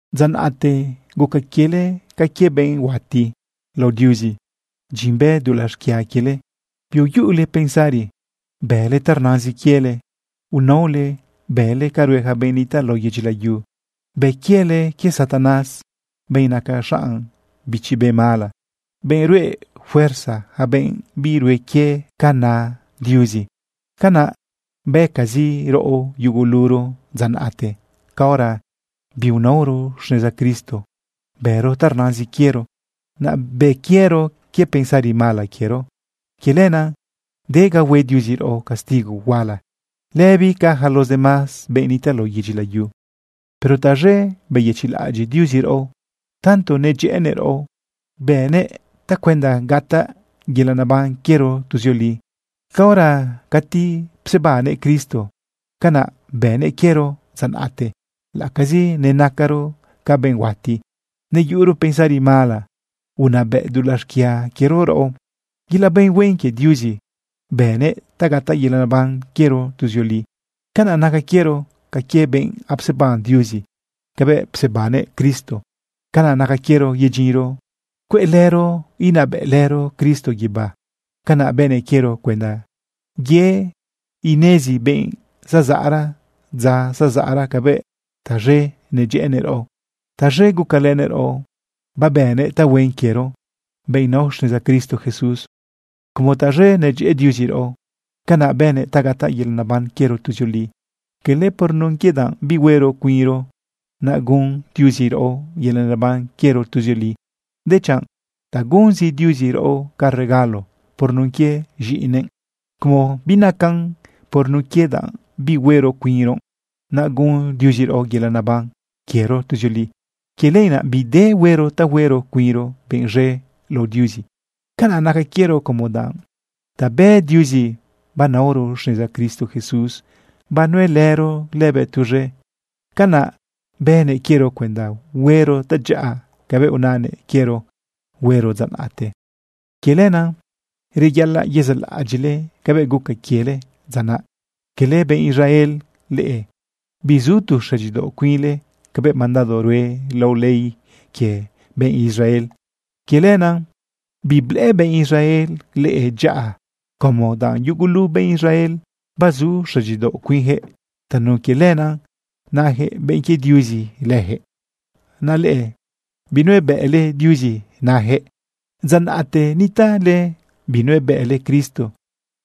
Dza naꞌte guca quiele ca quie benꞌ huati lao Diuzi. Dyin bë dulaꞌ xquia quiele, biyuꞌule pensari bële ta rnazin quiele. Unaole bële ca rue yaca benꞌ nitaꞌ lao yedyi layu. Bë quiele quie Satanás, benꞌ naca xanꞌ bichi be mala, benꞌ ruꞌe fuerza yaca benꞌ birue quie ca na Diuzi. Canaꞌ bëcazi raꞌo yuguluro dza naꞌte caora biunaoro xneza Cristo. Bëro ta rnazin quiero, naꞌ bë quiero quie pensari mala quiero. Quie lenaꞌ de ga hue Diuzi raꞌo castigo huala lëbi ca yaca los demás benꞌ nitaꞌ lao yedyi layu. Pero taz̃e beyëchiꞌlaꞌadyiꞌ Diuzi raꞌo. Tanto nedyëꞌënëꞌ raꞌo bënëꞌ tacuenda gataꞌ yelaꞌ neban quiero tuzioli caora cati psebannëꞌ Cristo. Canaꞌ bënëꞌ quiero dza naꞌte laꞌacazi nenacaro ca benꞌ huati, neyuꞌuro pensari mala unabëꞌ dulaꞌ xquia quiero raꞌo. Yelaꞌ benꞌ huen quie Diuzi bënëꞌ ta gataꞌ yelaꞌ neban quiero tuzioli. Canaꞌ naca quiero ca quie benꞌ apseban Diuzi cabëꞌ psebannëꞌ Cristo. Canaꞌ naca quiero yedyinro cueꞌlëro inabëꞌlëro Cristo guibá. Canaꞌ bënëꞌ quiero cuenda ye inezi benꞌ zazaꞌra dza zazaꞌra cabëꞌ taz̃e nedyëꞌënëꞌ raꞌo, taz̃e gucalënëꞌ raꞌo babënëꞌ tahuen quiero, benꞌ nao xneza Cristo Jesús. Como taz̃e nedyëꞌë Diuzi raꞌo, canaꞌ bënëꞌ ta gataꞌ yelaꞌ neban quiero tuzioli. Cala por nun quie danꞌ bi huero cuinro, naꞌ gun Diuzi raꞌo yelaꞌ neban quiero tuzioli, dechanꞌ ta gunzi Diuzi raꞌo ca regalo por nun quie z̃iꞌinëꞌ. Como binacan por nun quie danꞌ bi huero cuinro, naꞌ gun Diuzi raꞌo yelaꞌ neban quiero tuzioli, quie lenaꞌ bide bi huero ta huero cuinro benꞌ z̃e lao Diuzi. Canaꞌ naca quiero, como danꞌ ta bë Diuzi banaoro xneza Cristo Jesús banuelëro lëbëꞌ tuz̃e. Canaꞌ bënëꞌ quiero cuenda huero tadyaꞌa cabëꞌ unanëꞌ quiero huero dza naꞌte. Quie lenaꞌ reyaꞌalaꞌ yezaꞌlaꞌadyiꞌle cabëꞌ guca quiele dza naꞌ. Cala benꞌ Israel leꞌe. Bizu tu xëdyidaoꞌ cuinle cabëꞌ mandado rue lao ley quie benꞌ Israel. Quie lenaꞌ biblëꞌë benꞌ Israel leꞌe dyaꞌa, como danꞌ yugulu benꞌ Israel bazu xëdyidaoꞌ cuinyaquëꞌ. Tanun quie lenaꞌ nayaquëꞌ benꞌ quie Diuzi lëjëꞌ, naꞌ leꞌe binuebëꞌle Diuzi nayaquëꞌ. Dza naꞌte nitaꞌle binuebëꞌle Cristo,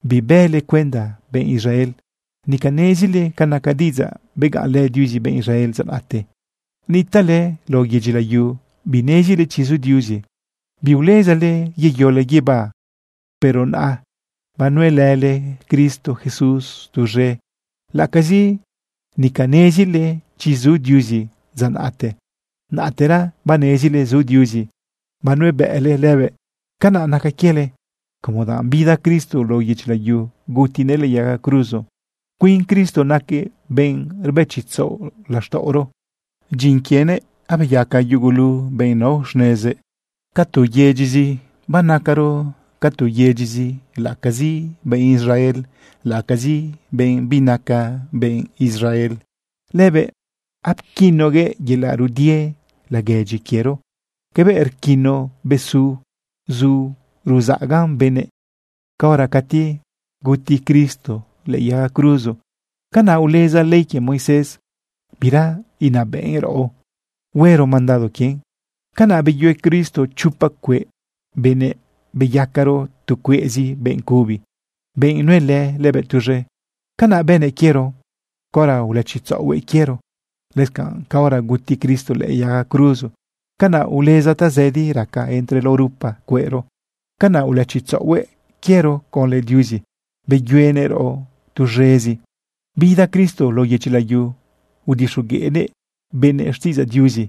bibële cuenda benꞌ Israel. Nica nezile ca naca diꞌidzaꞌ begaꞌnlë Diuzi benꞌ Israel dza naꞌte. Nitaꞌle lao yedyi layu binezile chi zu Diuzi, biulezale yeyole guibá. Pero naꞌa, banuelële Cristo Jesús tuz̃e. Laꞌacazi nica nezile chi zu Diuzi dza naꞌte, naꞌtera banezile zu Diuzi, banuebëꞌle lëbëꞌ. Canaꞌ naca quiele como danꞌ bida Cristo lao yedyi layu, gutinëꞌ lëꞌë yaga cruzo. Cuin Cristo naquëꞌ benꞌ rbëchitzaꞌo laxtaꞌoro. Dyin quienëꞌ abeyaca yugulu benꞌ nao xnezëꞌ ca tu yedyizi. Banacaro ca tu yedyizi laꞌacazi benꞌ Israel, laꞌacazi benꞌ binaca benꞌ Israel. Lëbëꞌ apquinoguëꞌ yelaꞌ rudie laguedyi quiero cabëꞌ ruquino besu zu ruzaꞌaga benëꞌ. Caora cati guti Cristo lëꞌë yaga cruzo, canaꞌ uleza ley quie Moisés, bira inabëꞌn raꞌo huero mandado quien. Canaꞌ beyue Cristo chopa cueꞌ benëꞌ beyacaro tu cueꞌzi benꞌ cubi, benꞌ nuelë lëbëꞌ tuz̃e. Canaꞌ bënëꞌ quiero caora ulëchitzaꞌohuëꞌ quiero. Lëscanꞌ caora guti Cristo lëꞌë yaga cruzo, canaꞌ uleza tazëdi raca entre lao rupa cueꞌro. Canaꞌ ulëchitzaꞌohuëꞌ quiero conlë Diuzi. Beyuenëꞌ raꞌo tuz̃ezi. Bida Cristo lao yedyi layu, udixogueꞌnëꞌ benëꞌ xtiꞌidzaꞌ Diuzi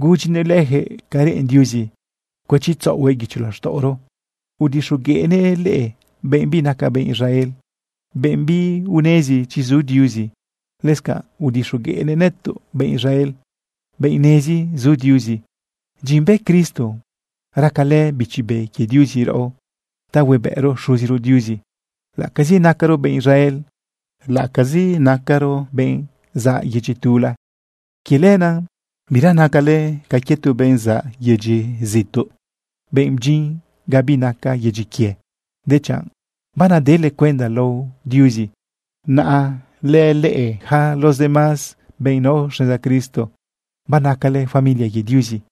gudyinëꞌ leyaquëꞌ ca reꞌen Diuzi cuëchitzaꞌohuëꞌ guicho laxtaꞌoro. Udixogueꞌnëꞌ leꞌe benꞌ binaca benꞌ Israel, benꞌ biunezi chi zu Diuzi. Lëscanꞌ udixogueꞌnëꞌ nëtoꞌ benꞌ Israel, benꞌ nezi zu Diuzi. Dyin bë Cristo racalë Bichi Be quie Diuzi raꞌo ta huebëꞌro Xuziro Diuzi, laꞌacazi nacaro benꞌ Israel, laꞌacazi nacaro benꞌ zaꞌ yedyi tula. Quie lenaꞌ bira nacale ca quie tu benꞌ zaꞌ yedyi zituꞌ, benꞌ bdyin ga binaca yedyi quie, dechanꞌ banadele cuenda lao Diuzi naꞌa lële yaca los demás benꞌ nao xneza Cristo. Banacale familia quie Diuzi.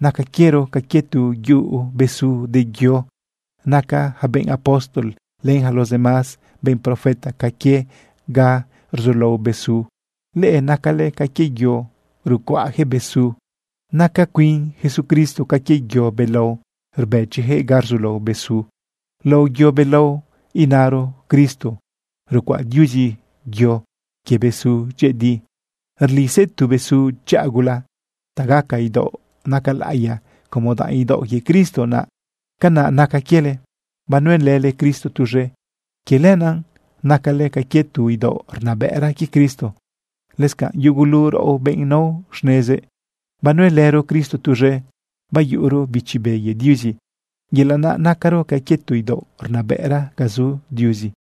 Naca quiero ca quie tu yuꞌu besu de yo. Naca yaca benꞌ apóstol len yaca los demás benꞌ profeta ca quie ga rzulao besu. Leꞌe nacale ca quie yo rucuaꞌjëꞌ besu. Naca cuin Jesucristo ca quie yo belao rbëchiyaquëꞌ ga rzulao bezu. Lao yo belao, inaro Cristo, rucuaꞌ Diuzi yo quie besu dyëꞌëdi. Rlisëꞌ tu besu dyaꞌa gula ta gaca idaoꞌ naca laꞌiya como danꞌ idaoꞌ quie Cristo naꞌ. Canaꞌ naca quiele, banuelële Cristo tuz̃e. Quie lenaꞌ nacale ca quie tu idaoꞌ rnabëꞌra quie Cristo. Lëscanꞌ yugulu raꞌo benꞌ nao xnezëꞌ, banuelëro Cristo tuz̃e bayuꞌuro Bichi Be quie Diuzi, yelaꞌ naꞌ nacaro ca quie tu idaoꞌ rnabëꞌra ga zu Diuzi.